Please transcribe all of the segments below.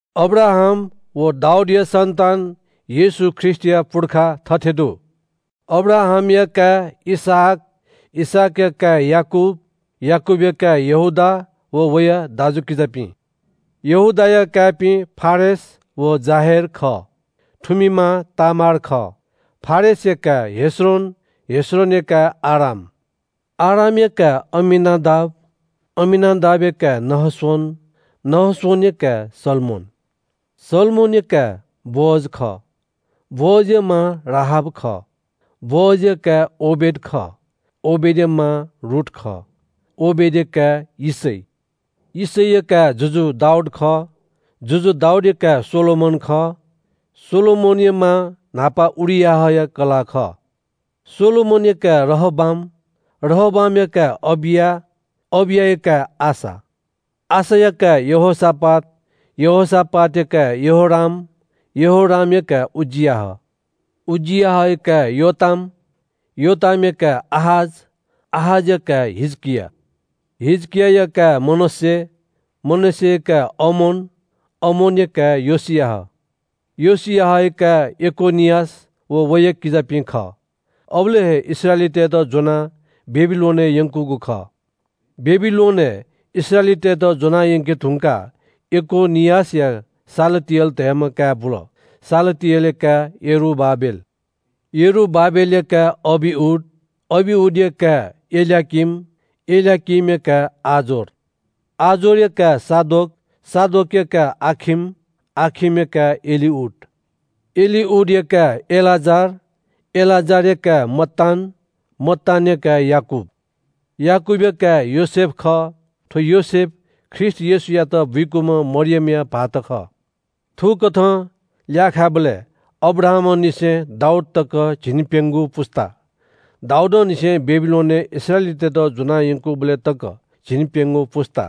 अब्राहाम व दाऊदया सन्‍तान येशू ख्रीष्‍टया पुर्खा थथे दु – अब्राहामया काय् इसहाक, इसहाकया काय् याकूब, याकूबया काय् यहूदा व वया दाजुकिजापिं। यहूदाया काय्‌पिं फारेस व जाहेर खः। थुमि मां तामार खः। फारेसया काय् हेस्रोन, हेस्रोनया काय् आराम, आरामया काय् अम्‍मीनादाब, अम्‍मीनादाबया काय् नहशोन, नहशोनया काय् सल्‍मोन, सल्‍मोनया काय् बोअज खः। बोअजया मां राहाब खः। बोअजया काय् ओबेद खः। ओबेदया मां रूथ खः। ओबेदया काय् यिशै, यिशैया काय् जुजु दाऊद खः। जुजु दाऊदया काय् सोलोमन खः। सोलोमनया मां न्‍हापा उरियाहया कलाः खः। सोलोमनया काय् रहबाम, रहबामया काय् अबिया, अबियाया काय् आसा, आसाया काय् यहोशापात, यहोशापातया काय् यहोराम, यहोरामया काय् उज्‍जियाह, उज्‍जियाहया काय् योताम, योतामया काय् आहाज, आहाजया काय् हिजकिया, हिजकियाया काय् मनश्‍शे, मनश्‍शेया काय् अमोन, अमोनया काय् योशियाह, योशियाहया काय् यकोनियास व वया किजापिं खः। अबलय् हे इस्राएलीतय्‌त ज्‍वनाः बेबिलोनय् यंकूगु खः। बेबिलोनय् इस्राएलीतय्‌त ज्‍वना यंके धुंकाः यकोनियासया शालतिएल धयाम्‍ह काय् बुल। शालतिएलया काय् यरूबाबेल, यरूबाबेलया काय् अबिउद, अबिउदया काय् एल्‍याकीम, एल्‍याकीमया काय् आजोर, आजोरया काय् सादोक, सादोकया काय् आखिम, आखिमया काय् एलिउद, एलिउदया काय् एलाजार, एलाजारया काय् मत्तान, मत्तानया काय् याकूब, याकूबया काय् योसेफ खः। थ्‍व योसेफ ख्रीष्‍ट येशूयात बुइकूम्‍ह मरियमया भाःत खः। थुकथं ल्‍याःखाय् बलय् अब्राहामंनिसें दाऊद तक झिंप्‍यंगू पुस्‍ता, दाऊदंनिसें बेबिलोनय् इस्राएलीतय्‌त ज्‍वनायंकूबलय् तक झिंप्‍यंगू पुस्‍ता,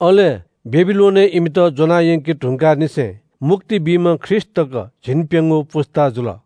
अले बेबिलोनय् इमित ज्‍वनायंके धुंकाःनिसें मुक्ति बीम्‍ह ख्रीष्‍ट तक झिंप्‍यंगू पुस्‍ता जुल।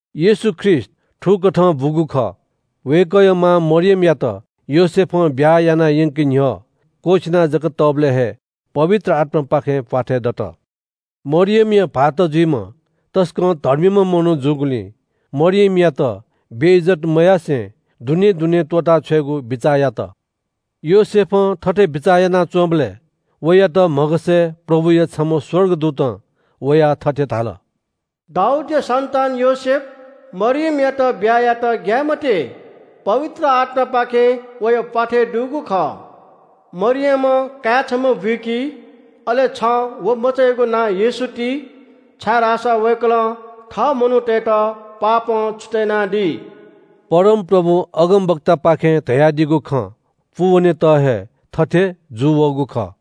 येशू ख्रीष्‍ट थुकथं बूगु खः। वय्‌कःया मां मरियमयात योसेफं ब्‍याहा याना यंके न्‍ह्यः क्‍वःछिना जक तःबलय् हे पवित्र आत्‍मापाखें प्‍वाथय् दत। मरियमया भाःत जुइम्‍ह तसकं धर्मीम्‍ह मनू जूगुलिं मरियमयात बेइज्‍जत मयासें दुनें दुनें त्‍वःताछ्वयेगु बिचाः यात। योसेफं थथे बिचाः यानाच्‍वंबलय् वयात म्‍हगसय् प्रभुया छम्‍ह स्‍वर्गदूतं वयाः थथे धाल – “दाऊदया सन्‍तान योसेफ, मरियमयात ब्‍याहा यायेत ग्‍याये मते। पवित्र आत्‍मापाखें वया प्‍वाथय् दुगु खः। मरियमं काय् छम्‍ह बुइकी, अले छं व मचायागु नां येशू ति, छाय्‌धाःसा वय्‌कलं थः मनूतय्‌त इमिगु पापं छुतय् यानादी।” परमप्रभुं अगमवक्तापाखें धयादीगु खँ पूवनेत हे थथे जूवःगु खः –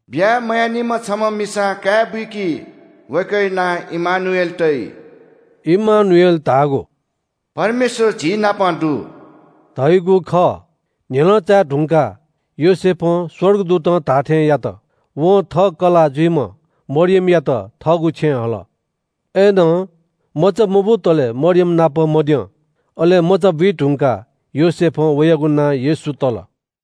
“ब्‍याहा मयानिम्‍ह छम्‍ह मिसां काय् बुइकी, वय्‌कःया नां इम्‍मानुएल तइ।” इम्‍मानुएल धाःगु “परमेश्‍वर झीनाप दु” धइगु खः। न्‍ह्यलं चाये धुंकाः योसेफं स्‍वर्गदूतं धाःथें यात। वं थः कलाः जुइम्‍ह मरियमयात थःगु छेँय् हल। अय्‌नं मचा मबुतले मरियम नाप मद्यं। अले मचा बुइधुंकाः योसेफं वयागु नां येशू तल।